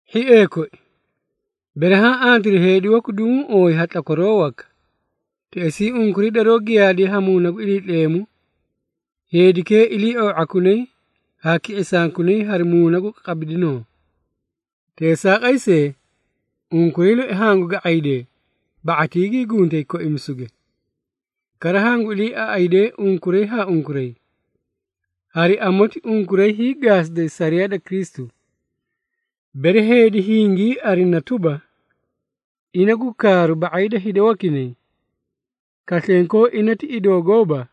Hhiee koi, bere haã antiri heedi waku duguũ ooyi ha tlakwaroo waka, teꞌesii unkuray daroó giyaadiye ha Muuna gu Iliitleemu, heedikee ilii⁄oo⁄akunay haa ki⁄isankunay hari muuna gu qabidinoo. Teesaaqay see, unkuray loi hangu ga⁄aydee ba⁄atii gii guntay koimisuge. Kara hangu iliiaꞌaydee unkuray haa unkuray, hari amoti unkuray hiigaasiday sariyaa da Kristu. Bere heedi hingii arina tuba, ina gu kaaru ba⁄ay da hida wakinay, kaslenkoo ina ti idoo gooba,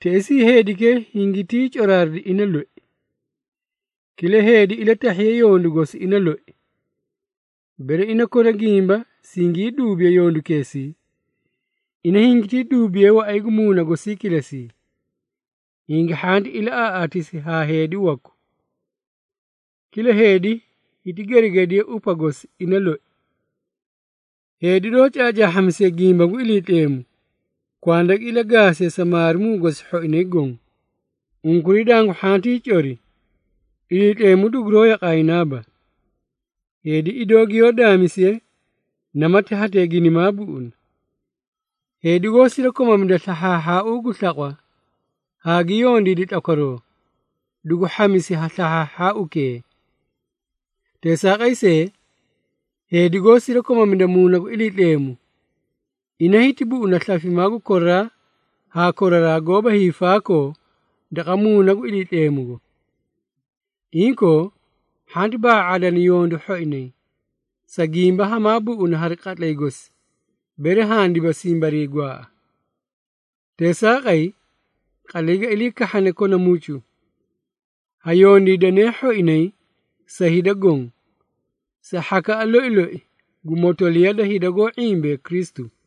teꞌesii heedikee hingitii coraaridi ina loi. Kila heedi ilatahhiye yondu gosi ina loi. Bere ina kona gimba singii duubiye yondukeesii, ina hingitii duubiye waꞌay gu muuna gosii kilesii, hingi hhanti ilaꞌaaꞌaatisi haa heedi waku. Kila heedi hiti geregedi upa gosi ina loi. Heedi doó caacaahhamisiye gimba gu Iliitleemu, kwanda gi ilagaasiye sa maarimuu gosi hhoinay goõ. Unkuray dangu hhantii cori, Iliitleemu duguroó yaqaayinaaba. Heedi idoo giyoó daamisiye, namati hetee ginimaa buꞌuna. Heedi goó sirakomamida slahhaahhaau gu slaqwa haa gi yondiidi tlakwaroo, dugu hhamisi ha slahhaahhaaukee. Teesaaqay see, heedi goó sirakomamida Muuna gu Iliitleemu, ina hiti buꞌuna slafimaa gu koraraa haa koraraa goóba hiifaakoo daqa Muuna gu Iliitleemugo. Inkoo, hhanti ba⁄aa⁄aadana yondu hhoinay, sa gimba hamaa buꞌuna hari qatlay gosi, bere handiba simbarii gwaaꞌa. Teesaaqay, qatlay ga ilii kahhane kona mucu, ha yondiidanee hhoinay sa hida goõ, sa hhakaꞌa loi loi gu motoliya da hida goó ⁄imbee Kristu.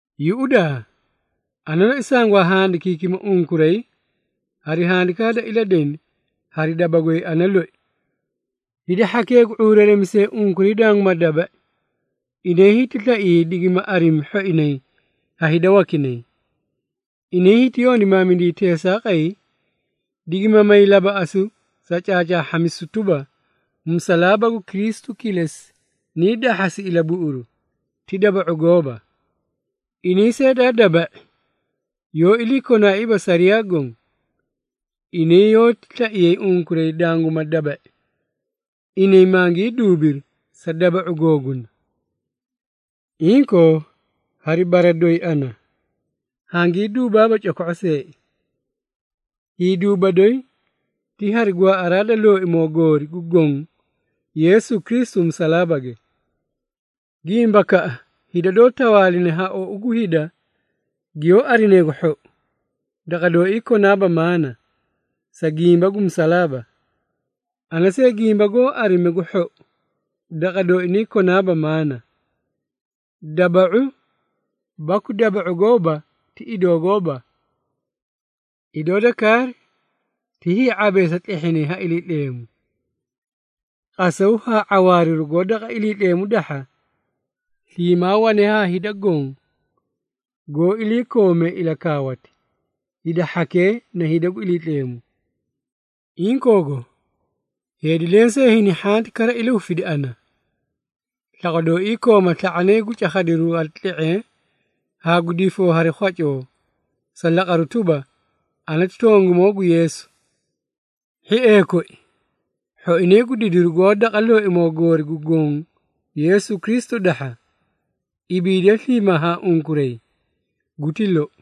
Yuꞌudaa! Ana loi sangwaa handikiikima unkuray hari handikaa da iladeni, hari daba goy ana loi! Hida hhakee gu ⁄uureeremisee unkuray danguma daba⁄i, inay hiti slaiyay digima arimi hhoinay ha hida wakinay. Inay hiti yondimaamidiyay teesaaqay, digima may labaꞌasu sa caacaahhamisu tuba, musalaaba gu Kristu kilesi nii dahhasi ilabuꞌuru, ti daba⁄u gooba. Inay see daa daba⁄i, yoó iliikonaaiiba sariyaa goõ. Inay yoóti slaiyay unkuray danguma daba⁄i, inay mangii duubiri sa daba⁄u googuna. Inkoo, hari bara doyi ana, hangii duubaaba coko⁄o see. Hiiduuba doyi ti hari gwaaꞌaraa da Looimoo goori gu Goõ Yeesu Kristu musalaabage. Gimbakaꞌa hida doó tawaaline ha ou gu hida giyoó arinayi gu hhou, daqa dooii ana konaaba maꞌaana, sa gimba gu musalaaba. Ana see gimba goó arime gu hhou, daqa dooinay konaaba maꞌaana. Daba⁄u baku daba⁄u gooba ti idoo gooba. Idoo da kaari, ti hii⁄abeesa tlehhinay ha Iliitleemu! Qasaw haa ⁄awaariru goó daqa Iliitleemu dahha, sliimaa wane haa hida goõ, goó iliikoomee ilakaawati, hida hhakee na hida gu Iliitleemu. Inkoogo, heedi lensee hini hhanti kara ilahufidi ana. Slaqwa dooii kooma sla⁄anay gu cakhadiru hari tle⁄eẽ haa gu difoo hari khwacoo sa laqaru tuba, ana ti tongimoo gu Yeesu. Hhiee koi, hhoinay gu didiru goó daqa Looimoo goori gu Goõ Yeesu Kristu dahha, ibiidiye sliimaa haa unkuray. Guti lou.